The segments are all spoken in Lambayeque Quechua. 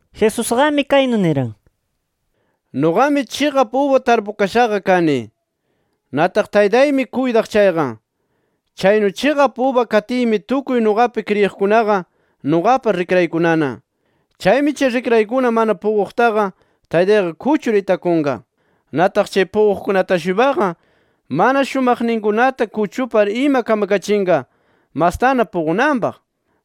Jesusqami kaynu niran: “Nuqami chiqap uba tarpukashaqa kani. Nataq Taytaymi kuytaq chayqa. Chaynu chiqap uba katiymi tukuy nuqapi kriyiqkunaqa nuqapa rikraykunana. Chaymi chay rikraykuna mana puquqtaqa, Taytayqa kuchur itakunqa. Nataq chay puquqkunata-shuypaqa mana shumaqninkunata kuchupar ima kamkachinqa, mastana puqunanpaq.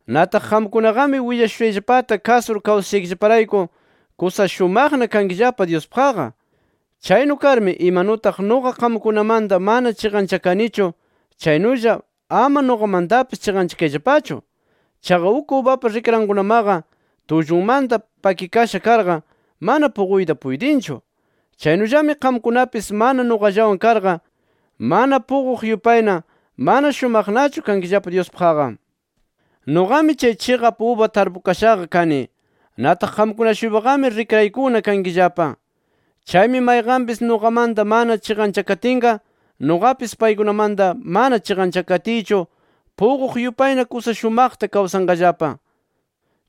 Nataq qamkunaqami willashushayllapata kasur kawsashaykillaparayku kusa shumaqna kankillapa Dyuspaqqa. Chaynu karmi imanutaq nuqa qamkunamanta mana chiqanchakanichu, chaynulla ama nuqamantapis chiqanchakayllapachu. Chaqa uk ubapa rikrankunamaqa tullunmanta pakikasha karqa, mana puquyta puytinchu. Chaynullami qamkunapis mana nuqallawan karqa, mana puquq yupayna mana shumaqnachu kankillapa Dyuspaqqa. “Nuqami chay chiqap uba tarpukashaqa kani. Nataq qamkuna-shuypaqami rikraykuna kankillapa. Chaymi mayqanpis nuqamanta mana chiqanchakatinqa, nuqapis paykunamanta mana chiqanchakatiychu puquq yupayna kusa shumaqta kawsanqallapa.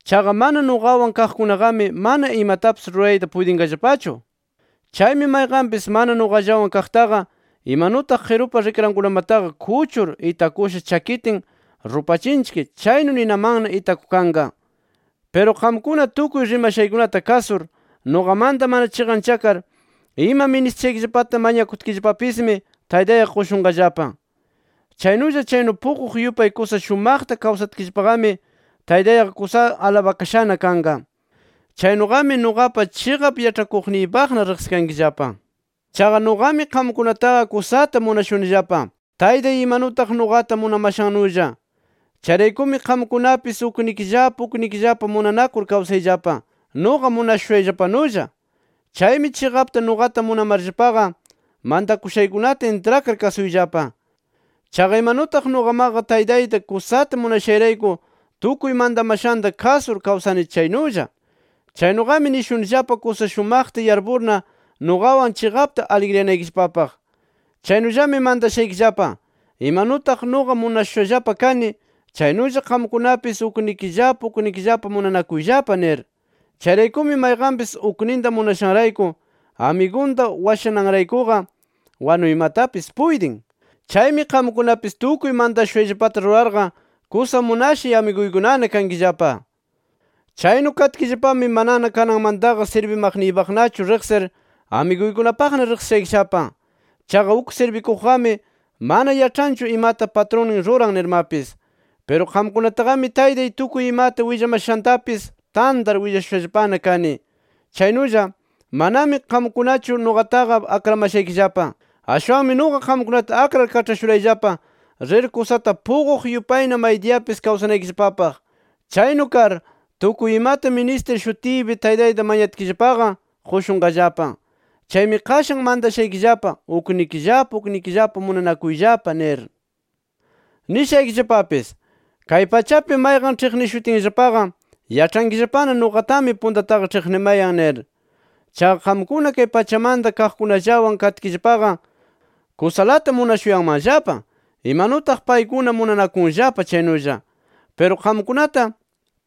Chaqa mana nuqawan kaqkunaqami mana imatapis rurayta puytinqallapachu. Chaymi mayqanpis mana nuqallawan kaqtaqa, imanutaq qirupa rikrankunamataqa kuchur itakusha chakitin rupachinchik, chaynu ninamanna itakukanqa. “Piru qamkuna tukuy rimashaykunata kasur, nuqamanta mana chiqanchakar ima ministishaykillapata mañakutkillapapismi Taytayqa qushunqallapa. Chaynulla, chaynu puquq yupay kusa shumaqta kawsatkillapaqami Taytayqa kusa alabakashana kanqa. Chaynuqami nuqapa chiqap yaĉhakuyniypaqna riqsikankillapa. Chaqa nuqami qamkunataqa kusata munashunillapa, Taytay imanutaq nuqata munamashannulla. Chayraykumi qamkunapis uknikillapa uknikillapa munanakur kawsayllapa, nuqa munashushayllapanulla. Chaymi chiqapta nuqata munamarllapaqa, mantakushaykunata intrakar kasuyllapa. Chaqa imanutaq nuqamaqa Taytayta kusata munashayrayku tukuy mantamashanta kasur kawsani chaynulla. “Chaynuqami nishunillapa kusa shumaqta yarpurna, nuqawan chiqapta aligriyanaykillapapaq. Chaynullami mantashaykillapa: Imanutaq nuqa munashushallapa kani, chaynulla qamkunapis uknikillapa uknikillapa munanakuyllapa nir. “Chayraykumi mayqanpis ukninta munashanrayku amigunta washananraykuqa wanuymatapis puytin. Chaymi qamkunapis tukuy mantashushayllapata rurarqa kusa munashay amiguykunana kankillapa. Chaynu katkillapami manana kananmantaqa sirbimaqniypaqnachu riqsir, amiguykunapaqna riqsishaykillapa. Chaqa uk sirbikuqqami mana yaĉhanchu imata patrunnin ruran nirmapis. Piru qamkunataqami Taytay tukuy imata willamashantapis tantar willashushallapana kani. Chaynulla manami qamkunachu nuqataqa akramashaykillapa. Ashwanmi nuqa qamkunata akrar kaĉhashurayllapa rir kusata puquq yupayna maydiyapis kawsanaykillapapaq. Chaynu kar, tukuy imata ministir shutiypi Taytayta mañatkillapaqa qushunqallapa. Chaymi qashan mantashaykillapa: Uknikillapa uknikillapa munanakuyllapa nir. “Nishaykillapapis: Kay pachapi mayqan ĉhiqnishutinllapaqa yaĉhankillapana nuqatami puntataqa ĉhiqnimayan nir. Chaqa qamkuna kay pachamanta kaqkunallawan katkillapaqa, kusalata munashuyanmanllapa, imanutaq paykuna munanakunllapa chaynulla. Piru qamkunata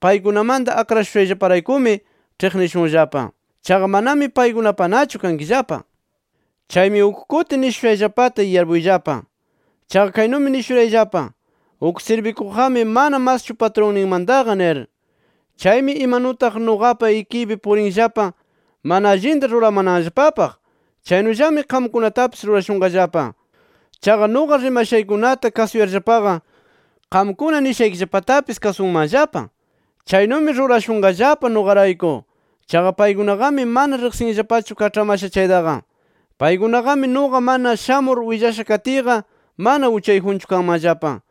paykunamanta akrashushayllaparaykumi ĉhiqnishunllapa. Chaqa manami paykunapanachu kankillapa. Chaymi uk kuti nishushayllapata yarpuyllapa. Chaqa kaynumi nishurayllapa: Uk sirbikuqqami mana maschu patrunninmantaqa nir. Chaymi imanutaq nuqapa ikiypi puriranllapa mana allinta ruramananllapapaq, chaynullami qamkunatapis rurashunqallapa. Chaqa nuqa rimashaykunata kasuyarllapaqa, qamkuna nishaykillapatapis kasunmanllapa. Chaynumi rurashunqallapa nuqarayku. Chaqa paykunaqami mana riqsinllapachu kaĉhamasha chaytaqa. “Paykunaqami nuqa mana shamur willasha katiyqa mana uchayjunchu kanmanllapa.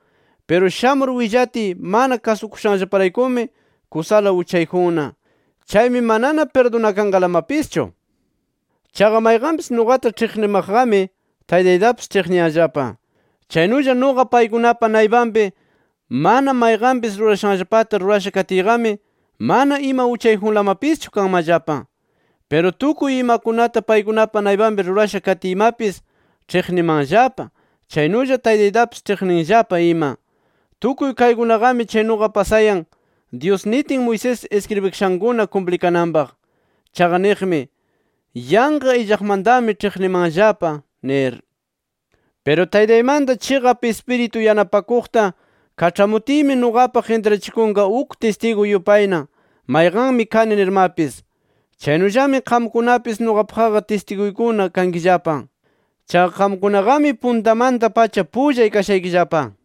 Piru shamur willatiy mana kasukushanllaparaykumi kusala uchayjunna. Chaymi manana pirdunakanqalamapischu. Chaqa mayqanpis nuqata ĉhiqnimaqqami Taytaytapis ĉhiqniyanllapa. Chaynulla nuqa paykunapa naypanpi mana mayqanpis rurashanllapata rurasha katiyqami mana ima uchayjunlamapischu kanmanllapa. Piru tukuy imakunata paykunapa naypanpi rurasha katiymapis, ĉhiqnimanllapa, chaynulla Taytaytapis ĉhiqninllapa ima. Tukuy kaykunaqami chaynuqa pasayan, Dyus nitin Moisés iskribikashankuna kumplikananpaq. Chaqa niqmi: ‘Yanqa illaqmantami ĉhiqnimanllapa’ nir. “Piru Taytaymanta Chiqap Ispiritu Yanapakuqta kaĉhamutiymi nuqapaq intrachikunqa uk tistigu yupayna mayqanmi kani nirmapis. Chaynullami qamkunapis nuqapaqqa tistiguykuna kankillapa. Chaqa qamkunaqami puntamanta-pacha pullay kashaykillapa.